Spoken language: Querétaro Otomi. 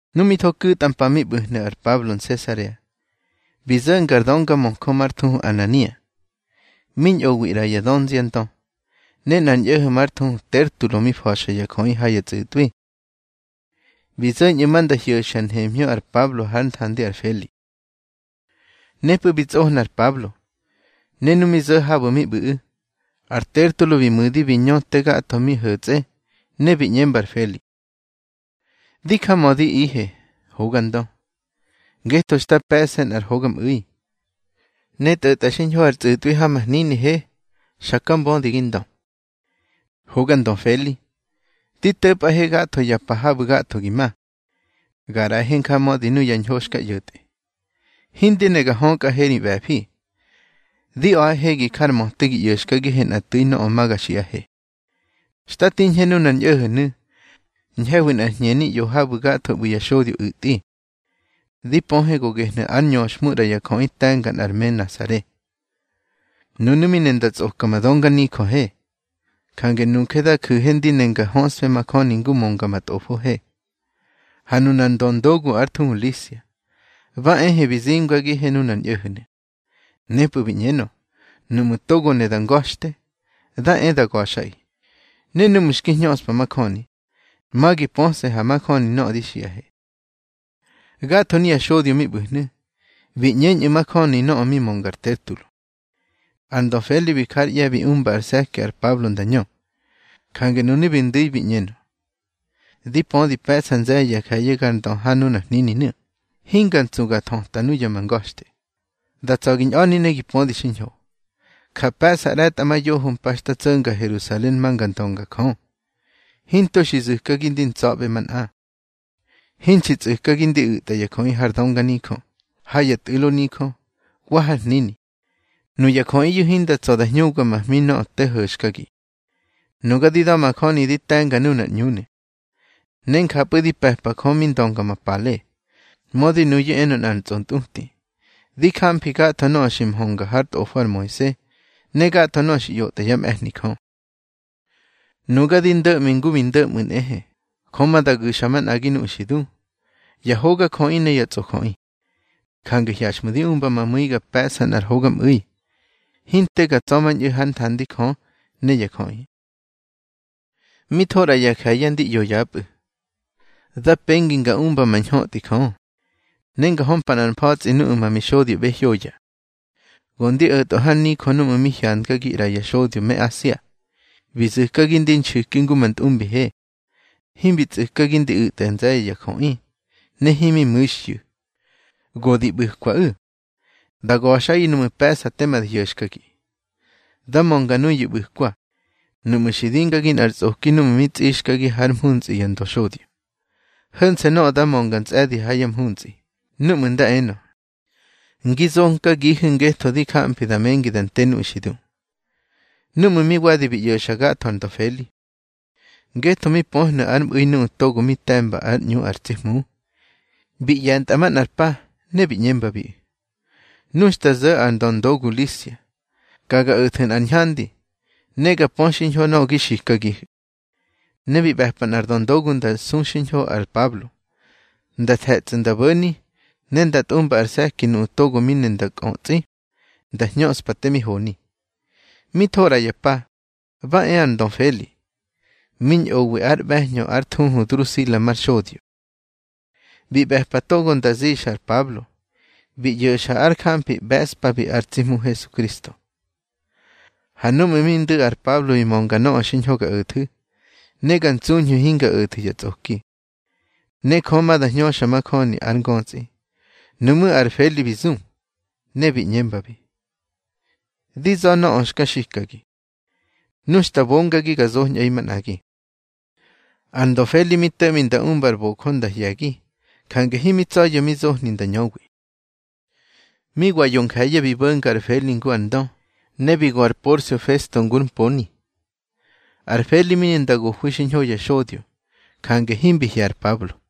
Nu mi tho ku̱tꞌa mpa mi ꞌbu̱hnu̱ ar Pablo Nsesarea, bi zo̱nga ar döngamöjö már thuhu Anania, mi ñꞌowi ꞌra ya dönziandö, ne nꞌar ñꞌo̱ho̱ már thuhu Tertulo mi fa̱xa ya jöꞌi ha ya tsꞌu̱tꞌwi. Bi zo̱ñꞌu̱ ma nda hyo̱xhya nhemhñö ar Pablo hár nthandi ar Feli. Nepꞌu̱ bi tsꞌohna ar Pablo, ne nu mi zo̱ habu̱ mi ꞌbu̱ꞌu̱, ar Tertulo bi mu̱di bi ñö te gatho mi ho̱tsꞌe, ne bi ꞌñemba ar Feli: —Di jamödihe, hoga ndö, ngetho xta pe̱ꞌse nꞌar hogamꞌu̱i, ne tꞌo̱tꞌa xiñho ar tsꞌu̱tꞌwi ha ma hninihe, xaka mbödi gi ndö. Hoga ndö Feli, di to̱pꞌahe gatho ya pa habu̱ gatho gi ma, ga ꞌraꞌahe njamödi nuya ñho xka ꞌyo̱tꞌe. Hindi ne ga hökꞌahe ri ꞌbe̱fi. Di a̱ꞌahe gi jar möte gi ꞌyo̱xkagihe nꞌa tsi tu̱i nöꞌö ma ga xiꞌahe. Xta tiñhe nunar ñꞌo̱ho̱nu̱, ñhe̱hwi nꞌar hñeni ꞌyo habu̱ gatho ꞌbu̱ ya xodyo u̱tꞌi. Di pöhe go gehnu̱ ár ñöxhmu ꞌra ya jöꞌi te̱nga nꞌar me Nasare. Nunu̱ mi ne nda tsꞌoka ma dönganijöhe. Jange nuje da ju̱he ndi ne nga höꞌsfe majöni ngu mönga ma tꞌofohe. Ha nunar ndöndogu ár thuhu Lisia, ba ehe bi zimgagihe nunar ñꞌo̱ho̱nu̱. Nepꞌu̱ bi ꞌñenö, nuꞌmu̱ togo mi ne nda nga̱xte, nda e nda ga̱xꞌaꞌi. Ne núꞌmu̱ xki hñöꞌspa majöni, ma gi pöse̱ ha majöni nöꞌö di xiꞌahe. Gatho nuya xodyo mi ꞌbu̱hnu̱, bi ꞌñeñꞌu̱ majöni nöꞌö mi mönga ar Tertulo. Ar ndö Feli bi jár ꞌye̱ bi umba ar se̱ki ar Pablo nda ñö, jange nunu̱ bi ndu̱i bi ꞌñenö: —Di pödi pe̱ꞌsa nze̱ye̱ ya je̱ye̱ gar ndö ha nunar hnininu̱, hinga ntsu ga thöta nuya ma nga̱xte. Da tsa̱ gi ñꞌa̱ni ne gi pödi xiñho, ja pe̱ꞌsa ꞌre̱tꞌamayoho mpa xta tso̱nga Herusalen ma nga ndönga Jö. Hinto xi zu̱kagi di ntsa̱ꞌbe manꞌa. Hinxi tsꞌu̱kagi di u̱tꞌa ya jöꞌi har dönganijö, ha ya tꞌu̱lo nijö, wa har hnini. Nuya jöꞌiyu̱ hinda tsa̱ da hñubga ma hmi nöꞌö te ho̱xkagi. Nuga di da̱majöni di te̱nga nunar ꞌÑunu̱, ne njapꞌu̱ di pe̱pa Jö mi ndönga ma pale, mödi nuyu̱ enö nꞌar tsꞌontꞌuti. Di jamfi gatho nöꞌö xi mhönga hár tꞌofo ar Moise, ne gatho nöꞌö xi ꞌyotꞌa yá mꞌe̱hni Jö. Nuga di ndo̱ꞌmi ngu mi ndo̱mꞌu̱ nꞌehe, Jö ma da gu̱xa manꞌagi nuꞌu̱ xi du, ya hogajöꞌi ne ya tsꞌojöꞌi. Jange hyaxꞌmu̱ di umba ma mu̱i ga pe̱ꞌsa nꞌar hogamꞌu̱i, hinte ga tsa̱mañꞌu̱ hár nthandi Jö ne ya jöꞌi. Mi tho ꞌra ya je̱ye̱ ndi ꞌyo yapꞌu̱, da pengi nga umba ma ñhötꞌi Jö, ne nga hömpa nꞌar mfa̱tsꞌi nuꞌu̱ ma mixodyoꞌbe hyoya. Go ndi o̱tꞌö har nijö núꞌmu̱ mi hyangagi ꞌra ya xodyo me Asia. Bi zu̱kagi ndi nxu̱ki ngu ma ntꞌumbihe, himbi tsꞌu̱kagi ndi u̱tꞌa nze̱ye̱ ya jöꞌi, ne himi mu̱xhyu̱. Go di ꞌbu̱kwaꞌu̱, da ga̱xꞌaꞌi nuꞌmu̱ pe̱ꞌsa tema da hyo̱xkagi. Dá mönga nuyu̱ ꞌbu̱kwa nuꞌmu̱ xi dimgagi nꞌar tsꞌoki núꞌmu̱ bi tsꞌixkagi hár mhuntsꞌi ya ndöxodyo. Ho̱nse̱ nöꞌö da mönga ntsꞌe̱di ha yá mhuntsꞌi, núꞌmu̱ nda enö: Ngi zonkagihu̱ ngetho di jamfi da mengi da nte nuꞌu̱ xi du. Núꞌmu̱ mi wadi bi ꞌyo̱xa gatho ar ndö Feli, ngetho mi pöhnu̱ ár mꞌu̱i nuꞌu̱ togo mi te̱mba ár ꞌÑu ar tsi Hmu, bi ꞌye̱ntꞌa manꞌar pa, ne bi ꞌñembabiꞌu̱: —Nu xta zo̱ ar ndöndogu Lisia, ka ga o̱thu̱ nꞌar ñhandi, ne ga pö xiñho nöꞌö gi xikagihu̱. Ne bi ꞌbe̱pa nꞌar döndogu nda su xiñho ar Pablo, nda the̱tsꞌu̱ nda bo̱ni, ne nda tꞌumba ar se̱ki nuꞌu̱ togo mi ne nda kꞌötsꞌi nda hñöꞌspa te mi honi. Mi tho ꞌra ya pa, ba e ar ndö Feli, mi ñꞌowi ár ꞌbe̱hñö ár thuhu Drusila mar xodyo. Bi ꞌbe̱pa togo nda zixa ar Pablo, bi ꞌyo̱xa ár jamfi ꞌbe̱ꞌspabi ar tsi Hmu Hesukristo. Ha núꞌmu̱ mi ndu̱ ar Pablo bi mönga nöꞌö xiñho ga o̱thu̱, ne ga ntsuñhu̱ hinga o̱thu̱ ya tsꞌoki, ne Jö ma da hñöxa majöni ar ngötsꞌi, nuꞌmú̱ ar Feli bi zu, ne bi ꞌñembabi: —Di za̱ nöꞌö xka xikagi. Nu xta bongagi, ga zoñꞌaꞌi manꞌagi. Ar ndö Feli mi to̱ꞌmi nda umbar bojö nda hye̱gi, jange himi tsa̱ya̱ mi zohni nda ñöwi. Mi wa yo nje̱ye̱ bi bo̱nga ar Feli ngu ar ndö, ne bi go ar Porsio Festo ngúr mponi. Ar Feli mi ne nda gohwi xiñho ya xodyo, jange himbi hye̱ ar Pablo.